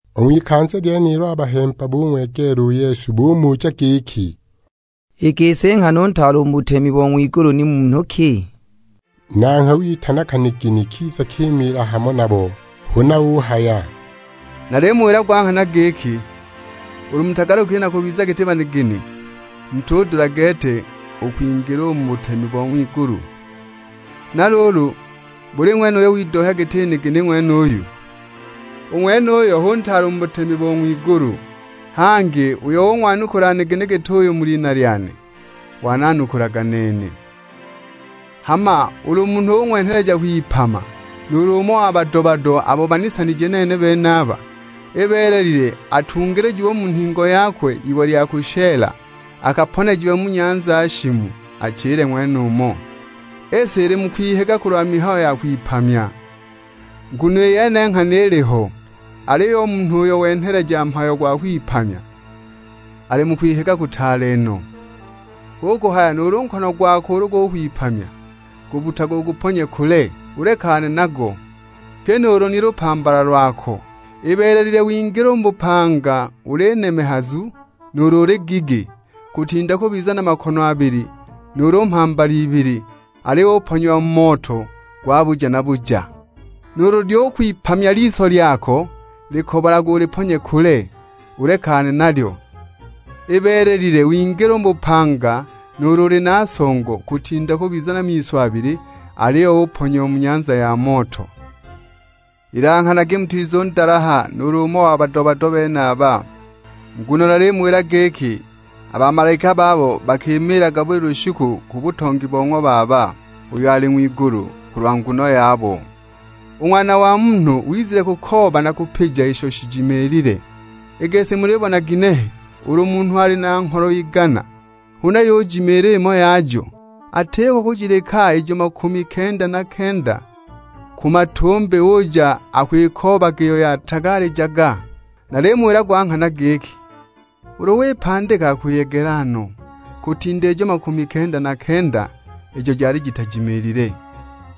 U ng'wikanza lyenilo a bahemba bung'wegeela u Yesu; bumuja giki, "I gisi nghana u ntaale u mu butemi bo ng'wigulu ni munhu ki?" Nanghwe witana kanigini, kiza kimiila hamo nabo. Huna uhaya, "Nalimuwila gwa nghana giki, ulu mutagalukile na kubiza giti banigini, mutudula gete u kwingila u mu butemi bo ng'wigulu. Na luulu buli ng'wene uyo widohya giti nigini ng'wenuyu, u ng'wenuyo hu ntaale u mu butemi bo ng'wigulu. Hangi uyo ung'wanukula nigini git'uyu mu lina lyane, wananukulaga nene." "Hama ulu munhu ung'wenheleja kwipama nuulu umo wa bado-bado abo banisanije nene benaba, ibeelelile atungilijiwe u mu nhingo yakwe iwe lya kushela, akaponejiwe mu nyanza shimu, achile ng'wenumo. I si ili mu kwihiga kulwa mihayo ya kwipamya, nguno i yene nghana iliho; aliyo u munhu uyo wenheleja mhayo gwa kwipamya, ali mu kwihiga kutaale no. Hu kuhaya nuulu nkono gwako ulu gukwipamya, gubbutage uguponye kule, ulekane nago; pye nuulu ni lupambala lwako. Ibeelelile wingile u mu bupanga uli nemehazu, nuulu uli gigi; kutinda kubiza na makono abili, nuulu mhambala ibili, aliyo uponyiwa mu moto gwa buja na buja. Nuulu lyukwipamya liso lyako, likobolage uliponye kule, ulekane nalyo. Ibeelelile wingile u mu bupanga nuulu uli na songo, kutinda kubiza na miso abili, aliyo uponyiwa mu nyanza ya moto." "Ilanghanagi mutizundalaha nuulu umo wabo a bado-bado benaba. Nguno nalimuwila giki, a bamalaika babo bakimiilaga buli lushiku ku butongi bo ng'wa Baba uyo ali ng'wigulu, kulwa nguno yabo. [ U Ng'wana wa Munhu, wizile kukooba na kupija isho shijimiilile.] I gisi mulibona ginehe, ulu munhu ali na ngholo igana, huna yujimiila imo yajo, atiko kujileka ijo makumi kenda na kenda ku matumbi, uja akwikoobaga iyo yatagaalijaga? Nalimuwila gwa nghana giki, ulu wipandika akwiyegela no, kutinda ijo makumi kenda na kenda, ijo jali jitajimiilile.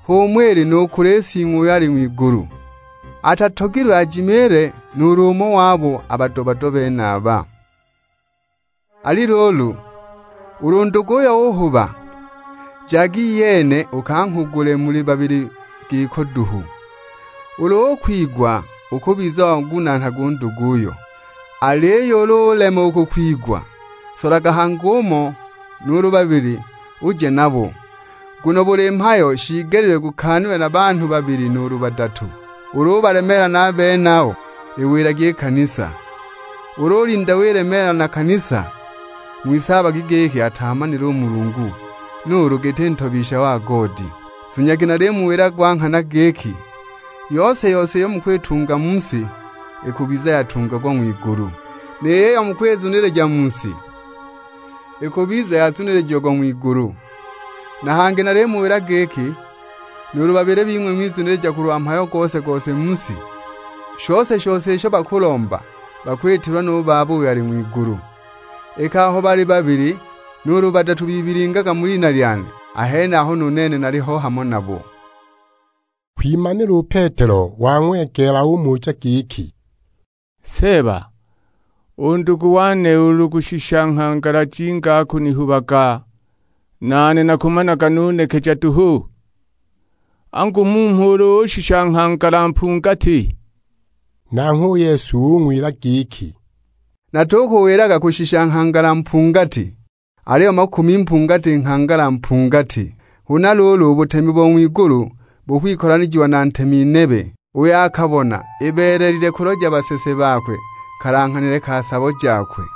H'umo ili nu kuli Sing'we uyo ali ng'wigulu, atatogilwe ajimiile nuulu umo wabo a bado-bado benaba." "Ali luulu, ulu nduguyo uhuba, jaga iyene ukanghugule muli babili giko duhu; ulu ukwigwa, ukubiza wangunaana u nduguyo. Aliyo ulu ulema u kukwigwa, solaga hangi umo nuulu babili uje nabo; nguno buli mhayo shiigelile gukaanilwe na banhu babili nuulu badatu. Ulu ubalemeela na a benabo, iwilagi i kanisa; ulu ulinda wilemeela na kanisa, ng'wisaabagi giki ataamanile Mulungu, nuulu giti ntobisha wa goodi. Zunyagi nalimuwila gwa nghana giki, yose-yose iyo mukwitunga mu si, ikubiza yatungagwa ng'wigulu; ni yiyo mukwizunilija mu si, ikubiza yazunilijiagwa ng'wigulu. Na hangi nalimuwila giki, nuulu babili bing'we bizunilija kulwa mhayo gose-gose mu si, shose-shose isho bakulomba bakwitilwa nu Baba uyo ali ng'wigulu. Iki aho bali babili nuulu badatu bibilingaga mu lina lyane, a henaho nu nene naliho hamo nabo." Kwimanila u Petelo wang'wegeela; umuja giki, "Seeba, u ndugu wane ulu kushisha nghangala jinga akunihubaga, nane nakumanaga nunekeja duhu? Angu mmho ulu kushisha nghangala mpungati!" Nanghwe u Yesu ung'wila giki, "Natukuwilaga kushisha nghangala mpungati, aliyo makumi mpungati nghangala mpungati. Huna luulu, u butemi bo ng'wigulu bukwikolanijiwa na ntemi nebe, uyo akabona ibeelelile kuloja basese bakwe kalanghanile ka sabo jakwe.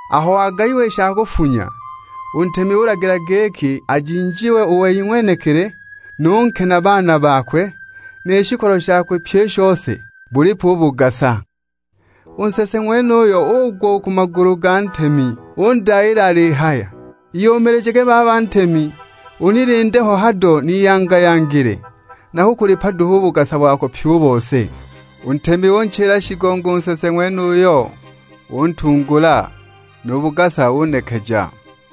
Aho wagayiwa i sha kufunya, u ntemi ulagila giki ajinjiwe u wei ng'wenekili, nu nke na a baana bakwe; ni shikolo shakwe pyi i shose, bulipwe u bugasa! U nsese ng'wenuyo ugwa u ku magulu ga ntemi undayiila alihaya; 'Iyumilijage baba ntemi unilinde ho hado niyanga-yangile, nakukulipa duhu u bugasa pyi u bose!' U ntemi unchila shigongo u nsese ng'wenuyo; untungula, nu bugasa unekeja.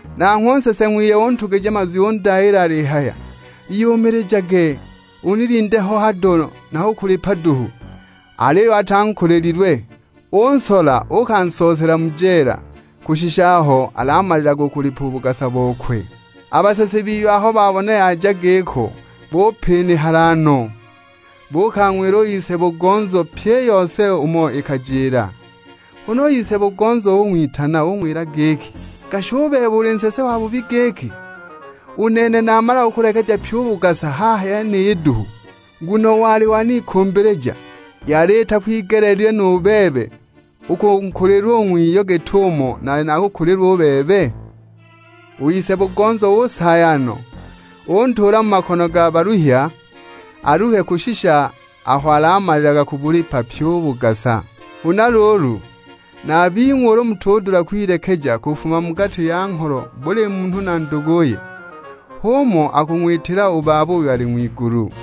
Nanghwe u nsese ng'wiye untugija mazwi undayiila alihaya, 'Iyumilijage unilinde ho hado nakukulipa duhu!' Aliyo atankulililwe, unsola uukansoosela mu jeela kushisha aho alamalilaga kubulipa u bugasa bokwe. A basese biye aho babona yaja giko bupinihala no, buukang'wila u saabo-bugonzo pyi i yose umo ikajila. Huna u ise-bugonzo ung'witana; ung'wila giki, 'Gashi u bebe uli nsese wabubi giki. U nene namala kukulekeja pyi u bugasa haha yeniyi duhu, nguno wali wanikumbilija! Yali itakwigeleelilwe nu bebe u kunkulilwa u ng'wiyo git'umo naali nakukulilwa u bebe?' U ise-bugonzo usaaya no, untuula mu makono ga baluhya, aluhe kushisha aho alamalilaga kubulipa pyi u bugasa. Huna luulu, na a bing'we ulu mutudula kwilekeja kufuma mu gati ya ngholo buli munhu na nduguye, h'umo akung'witila u Baba uyo ali ng'wigulu."